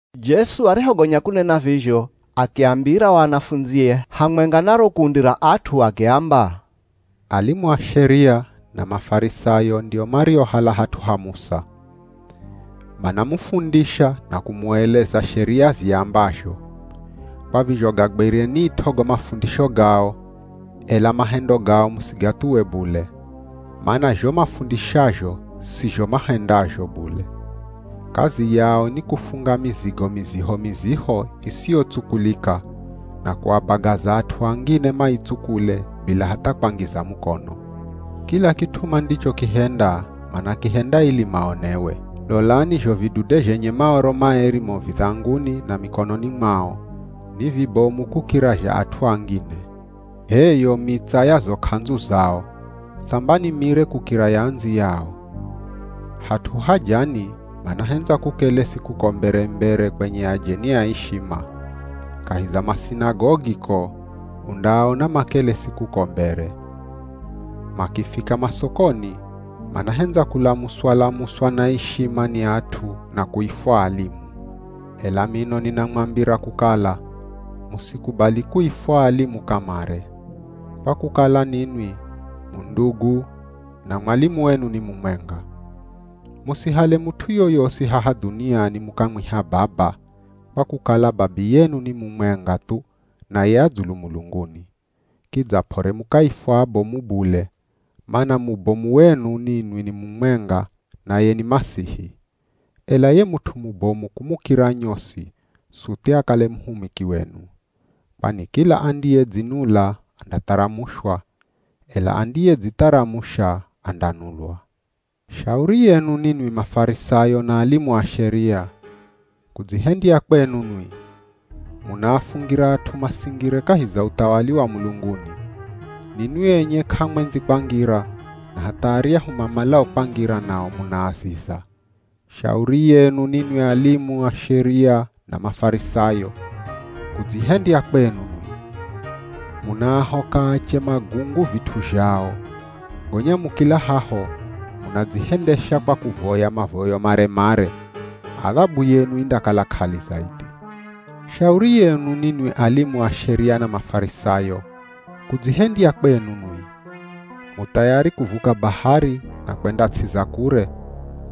Jesu arihogonya kunena vizho, akiambira o anafundzie hamwenga na ro kundi ra at'u akiamba, “Alimu a Sheria, na Mafarisayo ndio mariohala hat'u ha Musa. Manamufundisha na kumueleza Sheria ziambazho. Kwa vizho gagwirenit'o go mafundisho gao, ela mahendo gao musigathuwe bule. Mana zho mafundishazho si zho mahendazho bule. Kazi yao ni kufunga mizigo miziho-miziho isiyotsukulika na kuabagaza at'u angine maitsukule bila hatha kwangiza mukono. Kila kit'u mandichokihenda manakihenda ili maonewe. Lolani zho vidude zhenye Maoro maeri mo vidhanguni na mikononi mwao, ni vibomu kukira zha at'u angine. H'e yo mitsa ya zo k'andzu zao, samba ni mire kukira ya andziyao. Hat'u hajani manahendza kukelesi kuko mbere-mbere kwenye ajeni a ishima. Kahi za masinagogi ko, undaaona makelesi kuko mbere. Makifika masokoni, manahendza kulamuswa-lamuswa na ishima ni at'u na kuifwa ‘Alimu.’ Ela mino ninamwambira kukala, musikubali kuifwa ‘Alimu’ kamare, kwa kukala ninwi mu ndugu na mwalimu wenu ni mumwenga. Musihale mut'u yoyosi haha dhuniani mukamwiha ‘Baba’ kwa kukala Babiyenu ni mumwenga thu, naye a dzulu mulunguni. Kidza p'ore mukaifwa ‘Abomu’ bule, mana mubomu wenu ninwi ni mumwenga, naye ni Masihi. Ela ye mut'u mubomu kumukira nyosi suthi akale muhumiki wenu. Kwani kila andiyedzinula andatharamushwa, ela andiyedzitharamusha andanulwa.” “Shauri yenu ninwi Mafarisayo na alimu a Sheria, kudzihendya kwenu nwi! Munaafungira at'u masingire kahi za uthawali wa mulunguni. Ninwi enye k'amwendzi kwangira, na hatha aryahu mamalao kwangira nao munaaziza. [ Shauri yenu ninwi alimu a Sheria na Mafarisayo, kudzihendya kwenu nwi! Munaahoka ache magungu vit'u zhao. Gonya mukila haho, munadzihendesha kwa kuvoya mavoyo mare-mare. Adhabu yenu indakala k'ali zaidhi.] Shauri yenu ninwi alimu a Sheria na Mafarisayo, kudzihendya kwenu nwi! Mu thayari kuvuka bahari na kwenda ts'i za kure,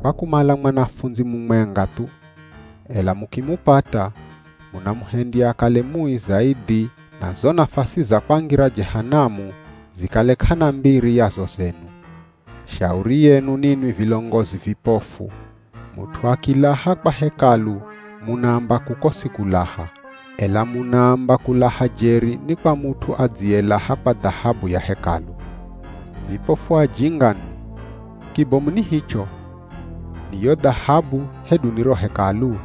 kwa kumala mwanafundzi mumwenga thu. Ela mukimupata, munamuhendya akale mui zaidhi na zo nafasi za kwangira Jehanamu zikale k'ana mbiri ya zo zenu.” “Shauri yenu ninwi vilongozi vipofu. Mut'u akilaha kwa Hekalu munaamba kuko si kulaha, ela munaamba kulaha jeri ni kwa mut'u adziyelaha kwa dhahabu ya Hekalu. Vipofu ajinga nwi! Kibomu ni hicho? Ni yo dhahabu hedu ni ro Hekalu?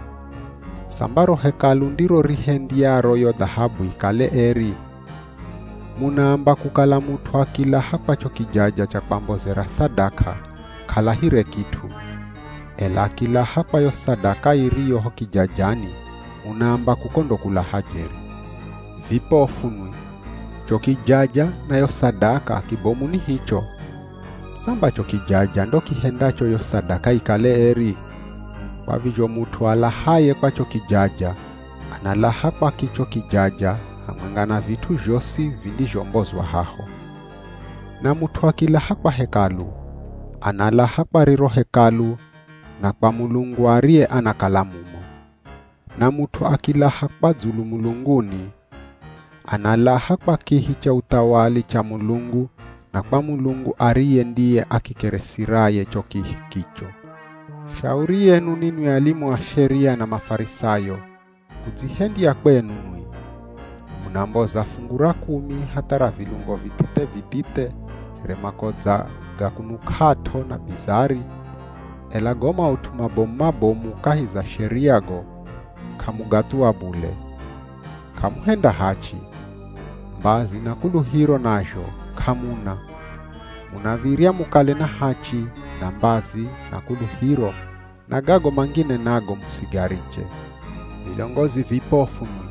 Samba ro Hekalu ndiro rihendyayo yo dhahabu ikale eri! Munaamba kukala mut'u akilaha kwa cho kijaja cha kwambozera sadaka k'alahire kit'u. Ela akilaha kwa yo sadaka iriyo ho kijajani munaamba kuko ndo kulaha jeri. Vipofu nwi, cho kijaja na yo sadaka kibomu ni hicho? Samba cho kijaja ndo kihendacho yo sadaka ikale eri! Kwa vizho mut'u alahaye kwa cho kijaja, analaha kwa kicho kijaja hamwenga na vit'u zhosi vindizhombozwa haho. Na mut'u akilaha kwa Hekalu, analaha kwa riro Hekalu na kwa Mulungu ariye anakala mumo. Na mut'u akilaha kwa dzulu mulunguni, analaha kwa kihi cha uthawali cha Mulungu na kwa Mulungu ariye ndiye akikeresiraye cho kihi kicho.” “Shauri yenu ninwi alimu a Sheria na Mafarisayo, kudzihendya kwenu nwi! Munamboza fungu ra kumi hatha ra vilungo vithithe-vithithe here makodza ga kunuk'at'o na bizari, ela go maut'u mabomu-mabomu kahi za Sheria go k'amugathuwa bule. K'amuhenda hachi. Mbazi na kuluhiro nazho k'amuna. Munav̱irya mukale na hachi, na mbazi, na kuluhiro, na gago mangine nago musigariche. Vilongozi vipofu nwi!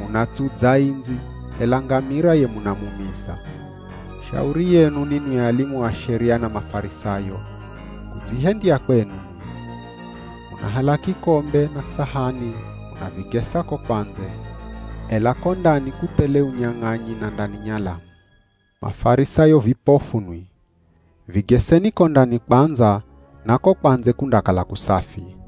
Munatsudza indzi, ela ngamira ye munamumiza.” “Shauri yenu ninwi alimu a Sheria na Mafarisayo, kudzihendya kwenu nwi! Munahala kikombe na sahani munavigesa ko kwa ndze, ela ko ndani kuthele unyang'anyi na ndani nyalamu. Mafarisayo vipofu nwi! Vigeseni ko ndani kwandza na ko kwa ndze kundakala kusafi.”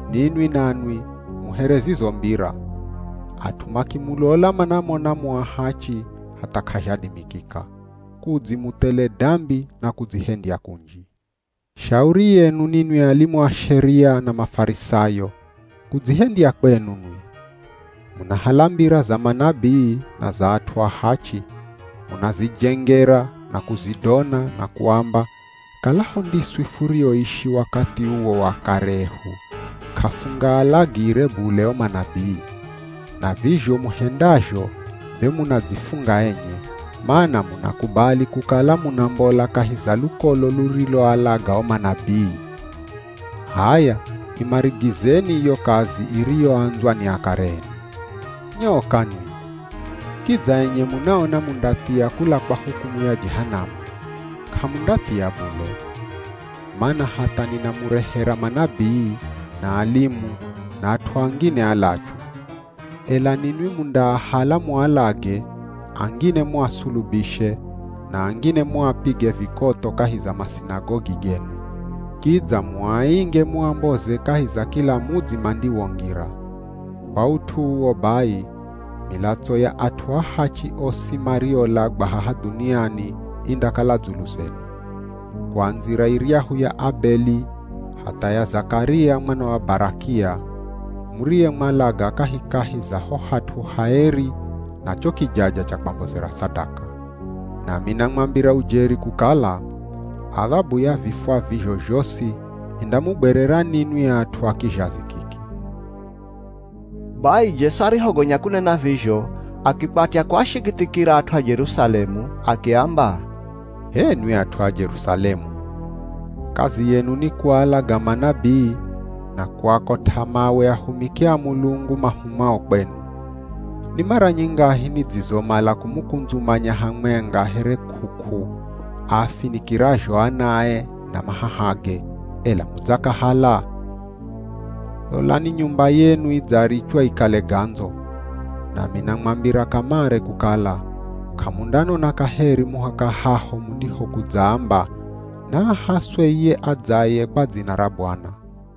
Ninwi nanwi mu here zizo mbira. At'u makimulola manamona mu ahachi hatha k'azhadimikika, kudzi mu thele dambi na kudzihendya kunji.” “Shauri yenu ninwi alimu a Sheria na Mafarisayo, kudzihendya kwenu nwi! Munahala mbira za manabii na za at'u ahachi, munazijengera na kuzidona na kuamba, ‘Kalaho ndiswi furioishi wakathi uwo wa akare ehu, k'afungaalagire bule o manabii.’ Na vizho muhendazho be munadzifunga enye, mana munakubali kukala munambola kahi za lukolo luriloalaga o manabii. H'aya imarigizeni iyo kazi iriyoandzwa ni akare enu. Nyoka nwi! Kidza enye munaona mundathia kula kwa hukumu ya Jehanamu, k'amundathia bule. Mana hatha ninamurehera manabii, na alimu, na at'u angine alachu. Ela ninwi mundaahala mualage, angine muasulubishe, na angine muapige vikotho kahi za masinagogi genu. Kidza muainge muamboze kahi za kila mudzi mandiwongira. Kwa ut'u uwo bai, milatso ya at'u ahachi osi mariolagwa haha dhuniani indakala dzulu zenu. Kuandzira iryahu ya Abeli hatha ya Zakaria mwana wa Barakia, muriyemwalaga kahikahi za ho hat'u haeri na cho kijaja cha kwambozera sadaka. Nami namwambira ujeri kukala, adhabu ya vifwa vizho zhosi indamugwerera ninwi at'u a kizhazi kiki.” Bai Jesu arihogonya kunena vizho, akikwatya kuashikithikira at'u a Jerusalemu. Akiamba, “H'enwi at'u a Jerusalemu. Kazi yenu ni kualaga manabii na kuakot'a mawe ahumiki a Mulungu mahumwao kwenu. Ni mara nyingahi nidzizomala kumukundzumanya hamwenga here k'uk'u aafinikirazho anae na mahahage, ela mudzakahala? Lolani nyumba yenu idzarichwa ikale gandzo. Nami namwambira kamare kukala, k'amundanona kaheri muhaka haho mundihokudzaamba, ‘Naahaswe iye adzaye kwa dzina ra Bwana.’”